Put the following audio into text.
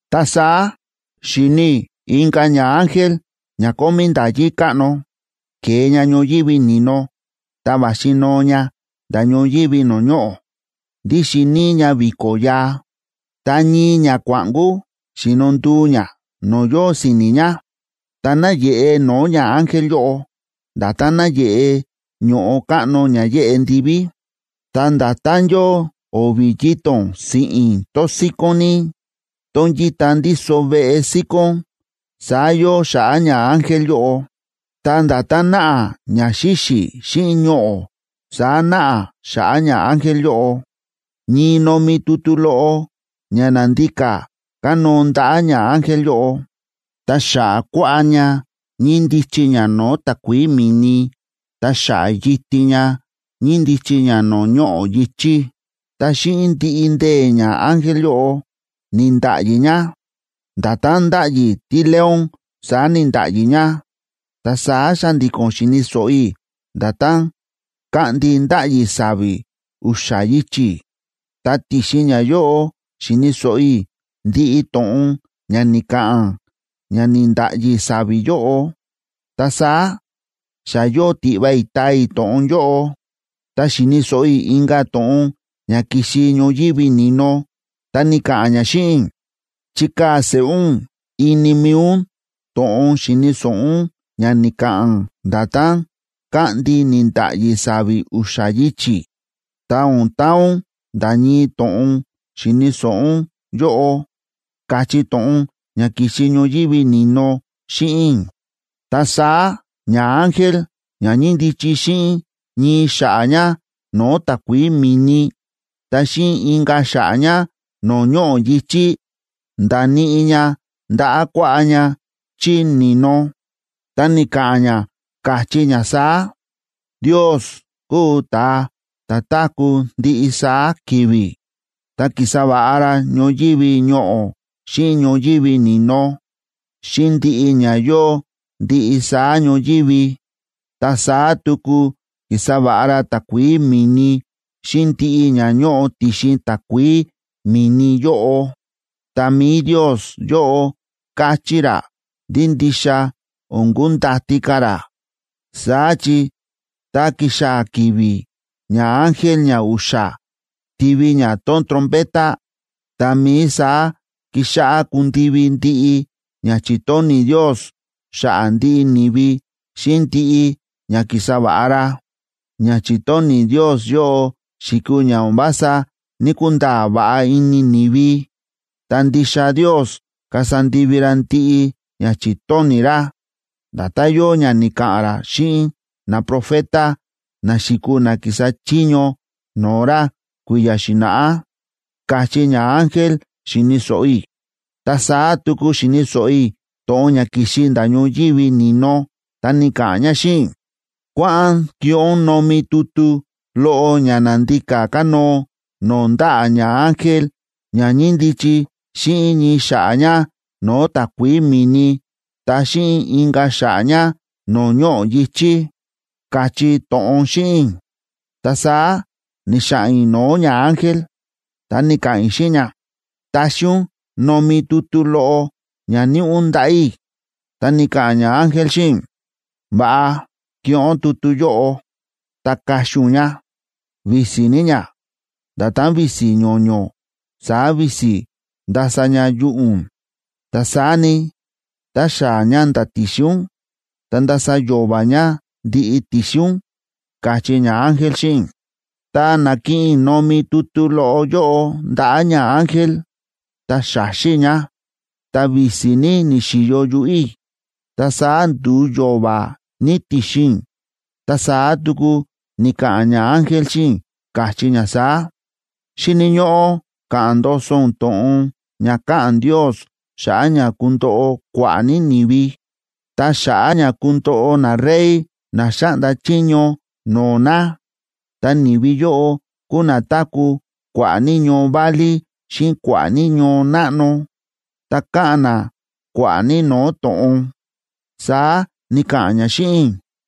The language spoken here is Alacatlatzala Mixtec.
Ta saá xi̱ni i̱ inka̱ ñaángel ña kómí nda̱yí káꞌno, ke̱e ña ñoyívi ni̱no, ta va̱xi noo ña nda̱ ñoyívi no̱o̱ ñoꞌo̱. Ndíxin níí ña vi̱ko̱ yaa, ta ñii ñakua̱ꞌnkú xi̱no nduu ña no̱o̱ yóo si̱ni̱ ña. Ta náyeꞌe no̱o̱ ñaángel yóꞌo, nda̱tán náyeꞌe ño̱ꞌo káꞌno ña yéꞌe ndiví. Ta nda̱tán yóo o̱vi̱ yito̱n siꞌi̱n tón síkón ní, tón yíta ndíso veꞌe síkón, saá yóo xa̱ꞌa̱ ñaángel yóꞌo. Ta nda̱tán náꞌa ña xíxi̱ xíꞌin ñoꞌo̱, saá náꞌa xa̱ꞌa̱ ñaángel yóꞌo. Ñii nomi tutu loꞌo ña na̱ndika kánóo ndaꞌa̱ ñaángel yóꞌo. Ta xa̱ꞌa̱ kuaꞌá ña ñíndichi ña no̱o̱ takuií mi̱ni, ta xa̱ꞌa̱ yitin ña, ñíndichi ña no̱o̱ ñoꞌo̱ yi̱chí. Ta xíꞌin ndiꞌi ndee̱ ñaángel yóꞌo ni̱nda̱ꞌyi ña. Nda̱tán ndáꞌyi tíleón, saá ni̱nda̱ꞌyi ña. Ta saá xa̱ndi̱ko̱n xi̱ni̱ so̱ꞌo i̱ nda̱tán káꞌndi ndáꞌyi sa̱vi̱ u̱xa̱ yichi̱, ta ti̱xin ñayóꞌo xi̱ni̱ so̱ꞌo i̱ ndiꞌi to̱ꞌon ña ni̱ka̱ꞌa̱n ña ni̱nda̱ꞌyi sa̱vi̱ yóꞌo. Ta saá, xa yóo tiꞌva i̱ taa i̱ to̱ꞌon yóꞌo, ta xi̱ni̱ so̱ꞌo i̱ inka̱ to̱ꞌon ña ki̱xi ñoyívi ni̱no, ta ni̱ka̱ꞌa̱n ña xíꞌin i̱: ―Chikaa̱ seꞌé ún ini mi̱i ún to̱ꞌon xi̱ni̱ so̱ꞌo ún ña ni̱ka̱ꞌa̱n nda̱tán káꞌndi ni̱nda̱ꞌyi sa̱vi̱ u̱xa̱ yichi̱, ta o̱n taa ún nda̱ ñii to̱ꞌon xi̱ni̱ so̱ꞌo ún yóꞌo ―káchí to̱ꞌon ña ki̱xi ñoyívi ni̱no xíꞌin i̱. Ta saá ñaángel ña ñíndichi xíꞌin ñii xa̱ꞌa̱ ña no̱o̱ takuií mi̱ni, ta xíꞌin inka̱ xa̱ꞌa̱ ña no̱o̱ ñoꞌo̱ yi̱chí, nda̱níꞌi ña ndaꞌa̱ kuaꞌá ña chí ni̱no, ta ni̱ka̱ꞌa̱n ña, káchí ña saá: ―Ndios kúu ta̱a ta̱ táku̱ ndiꞌi saá ki̱vi̱, ta ki̱sa va̱ꞌa ra ñoyívi ñoꞌo̱ xíꞌin ñoyívi ni̱no, xíꞌin ndiꞌi ña yóo ndiꞌi saá ñoyívi. Ta saá tuku ki̱sa va̱ꞌa ra takuií mi̱ni xíꞌin ndiꞌi ña ñóꞌo ti̱xin takuií mi̱ni yóꞌo. Ta mi̱i Ndios yóꞌo káchí ra ndí ndixa o̱n kundati ka̱ ra. Saá chi tá kixaa̱ ki̱vi̱ ñaángel ñau̱xa̱ tivi ña tón trompeta, tá mií saá kixáꞌá kundivi ndiꞌi ña chi̱tóni̱ Ndios xa̱ꞌa̱ ndiꞌi ni̱vi xíꞌin ndiꞌi ña ki̱sa va̱ꞌa ra. Ña chi̱tóni̱ Ndios yóꞌo xi̱kuu ña o̱n vása ní‑kunda̱a̱ va̱ꞌa ini ni̱vi, ta ndixa Ndios kasa ndivi ra ndiꞌi ña chi̱tóni̱ ra, nda̱tán yóo ña ni̱ka̱ꞌa̱n ra xíꞌin naprofeta, na xi̱kuu na ki̱sa chiño no̱o̱ ra kui̱ya̱ xi̱na̱ꞌá ―káchí ñaángel, xi̱ni̱ so̱ꞌo i̱. Ta saá tuku xi̱ni̱ so̱ꞌo i̱ to̱ꞌon ña ki̱xi nda̱ ñoyívi ni̱no, ta ni̱ka̱ꞌa̱n ña xíꞌin i̱: ―Kua̱ꞌa̱n kiꞌin ún nomi tutu loꞌo ña na̱ndika kánóo no̱o̱ ndaꞌa̱ ñaángel ña ñíndichi xíꞌin ñii xa̱ꞌa̱ ña no̱o̱ takuií mi̱ni, ta xíꞌin inka̱ xa̱ꞌa̱ ña no̱o̱ ñoꞌo̱ yi̱chí ―káchí to̱ꞌon xíꞌin i̱. Ta saá ni̱xa̱ꞌa̱n i̱ no̱o̱ ñaángel, ta ni̱ka̱ꞌa̱n i̱ xíꞌin ña: ―Taxi ún nomi tutu loꞌo ña níꞌi ún ndaꞌa̱ i̱. Ta ni̱ka̱ꞌa̱n ñaángel xíꞌin i̱: ―Va̱ꞌa kiꞌin ún tutu yóꞌo ta kaxi ún ña. Visi ní ña, nda̱tán visi ño̱ño̱, saá visi ndasa ña yuꞌu̱ ún. Ta saá ni, tá xaa̱ ña nda̱ ti̱xin ún, ta ndasa yo̱va̱ ña ndiꞌi ti̱xin ún ―káchí ñaángel xíꞌin i̱. Ta na̱kiꞌin i̱ nomi tutu loꞌo yóꞌo ndaꞌa̱ ñaángel, ta xa̱xi i̱ ña. Ta visi ní ni̱xi̱yo yuꞌu̱ i̱, ta saá ndu̱u yo̱va̱ ní ti̱xin i̱. Ta saá tuku ni̱ka̱ꞌa̱n ñaángel xíꞌin i̱, káchí ña saá: ―Xíni̱ ñóꞌó ka̱ꞌa̱n ndoso ún to̱ꞌon ña káꞌa̱n Ndios xa̱ꞌa̱ ña kundoꞌo kua̱ꞌa̱ ní ni̱vi, ta xa̱ꞌa̱ ña kundoꞌo narey na xáꞌnda chiño no̱o̱ na. Ta ni̱vi yóꞌo kúu na táku̱ kua̱ꞌa̱ ní ñoo válí xíꞌin kua̱ꞌa̱ ní ñoo náꞌno, ta káꞌa̱n na kua̱ꞌa̱ ní no̱o̱ to̱ꞌon ―saá ni̱ka̱ꞌa̱n ña xíꞌin i̱.